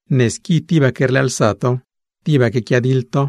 Ne squi tibaque rlëëlsa to, tibaque quiadiḻ to,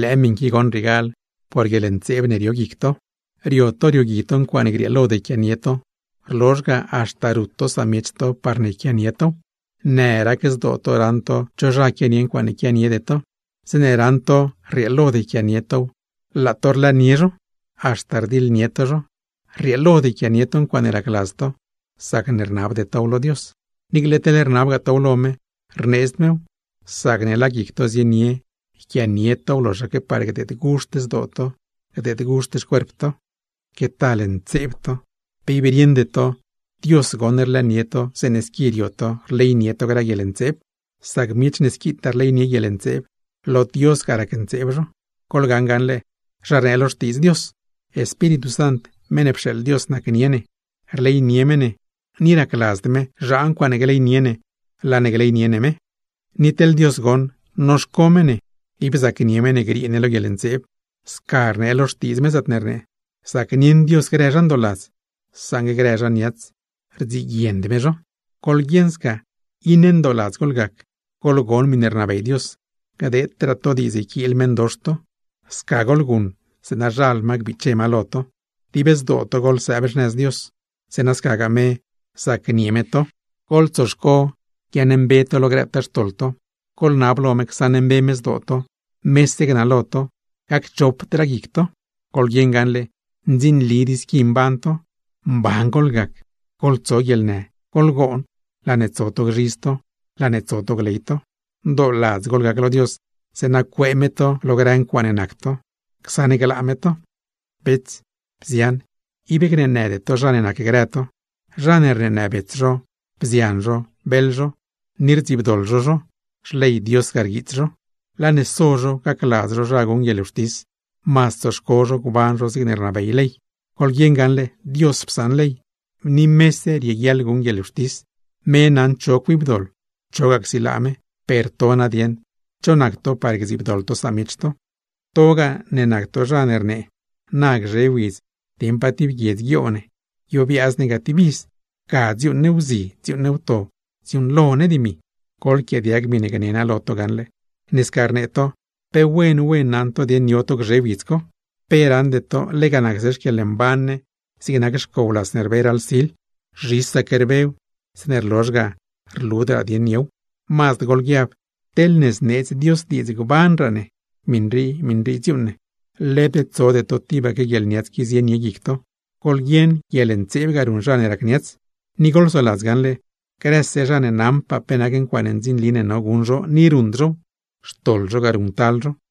lëë miṉ qui goṉ riegal por grë guieḻntseeb ne rio guic to. Rio to riogui to ncuaaṉe grieelod yquianie to, rlozh ga, haxta rut to samiech to parne yquianie tow. Në rac zdoo to raṉ to cho zha quianie ncuaaṉe quianiede to, zeeṉe raṉ to rrieelod yquianie tow laa to rlëënie zho, haxta rdiḻnie to zho. Rrieelod yquianie to ncuaaṉe racladz to, sacne rnabde tow lo Dios. Niicle teḻ rnabgaa tow lo me, rneedzd mew, sacne laa guic to zienie yquianie tow loxaque par gdeedguxt zdoo to, gdeedguxt xcuerp to. ¡Que tal ntseeb to! ¿Pe ib rieṉde to, Dios goṉ rlëënie to zeeṉe squi rio to rleynie to grë guieḻntseeb? Sac miech ne squitaa rleynie guieḻntseeb, lo Dios ga racntseeb zho. Goḻgaṉ gaṉle, zha rnee lo Xtiidz Dios: “Espíritu Sant, meṉ ne pxeeḻ Dios nacnie ne, rleynie me ne, ni racladzd me zhaa ncuaaṉe gleynie ne laa ne gleynie ne me.” Ni teḻ Dios goṉ, noxco me ne, ib zacnie me ne griee ne lo guieḻntseeb; sca rnee lo Xtiidz me, zaatne rnee: “Zacnieṉ Dios grë zha ndooladz, saṉgue grë zha niats, rdziguiend me zho.” Goḻguieṉ sca, iṉe ndooladz goḻgac, goḻgon miṉe rnabey Dios. Gdeetraa to diidz yquiil meṉdox to, sca goḻguṉ zeeṉa zhal ma gbiche ma lo to. Dib zdoo to goḻsëëb xnëz Dios, zeeṉa scagaa me zacnie me to. Goḻtsoxco guiaaṉmbe to lo grëtaa xtoḻ to, goḻnab lo me csaṉmbe me zdoo to, mese gnalo to, gacchopdraa guic to. ¡Goḻguieṉ gaṉle, ndzinlid i squi mban to! ¡Mban goḻgac, goḻtso guieḻnë, goḻgoon, laa ne tso to gzhidz to, laa ne tso to gley to! ¡Ndooladz goḻgac lo Dios, zeeṉa cuee me to lo grë ncuaaṉe nac to, csaṉglaa me to! Bets, bzian, ib gneenëde to zha ne nacgrë to. Zha ne rneenë bets zho, bzian zho, beḻ zho, ni rdziibdoḻ zho zho, Xley Dios ga rguiits zho. Laa ne so zho gacladz zho zha guṉ guieḻwxtis, mazd tsoxco zho gban zho zigne rnabey ley. Goḻguieṉ gaṉle, Dios psaṉ ley, ni mese rieguiaḻ guṉ guieḻwxtis, me naṉ zho cuibdoḻ, chogaa csilaa me; per to nadieṉ, ¿cho nac to par gdziibdoḻ to samiech to? Togaa ne nac to zha ne rnee: “Na gzhe widz dieṉ pa tib guiedz ne guioo ne, guiobiaaz ne ga tib iz, ga dziuuṉ ne wzi dziuuṉ ne wto, dziuuṉlo ne dimi”, goḻquiaadiag miṉe gne naa lo to gaṉle. Ne sca rnee to, ¡pe wen wen naṉ to dieṉ yo to gzhe widz co! ¿Pe raṉde to lega nacse xquieḻmban ne zigne nac xcow las ne rbe raḻ sil? Zhisaque rbew, zeeṉe rlozh ga rludraa dieṉ yow. Mazd goḻguiab: “Teḻne zneedz Dios diidz gbanraa ne, miṉ rii, miṉ rii dziuuṉ ne.” Led tsode tibaque guieḻniats qui zienie guic to, goḻguieṉ guieḻntseeb ga ruṉ zha ne rac niats. Ni goḻsoladza gaṉle: Grëse zha ne naṉpaa pe nac ncuaaṉe ndzinli ne no guṉ zho ni ruṉd zhow, xtoḻ zho ga ruṉctal zho.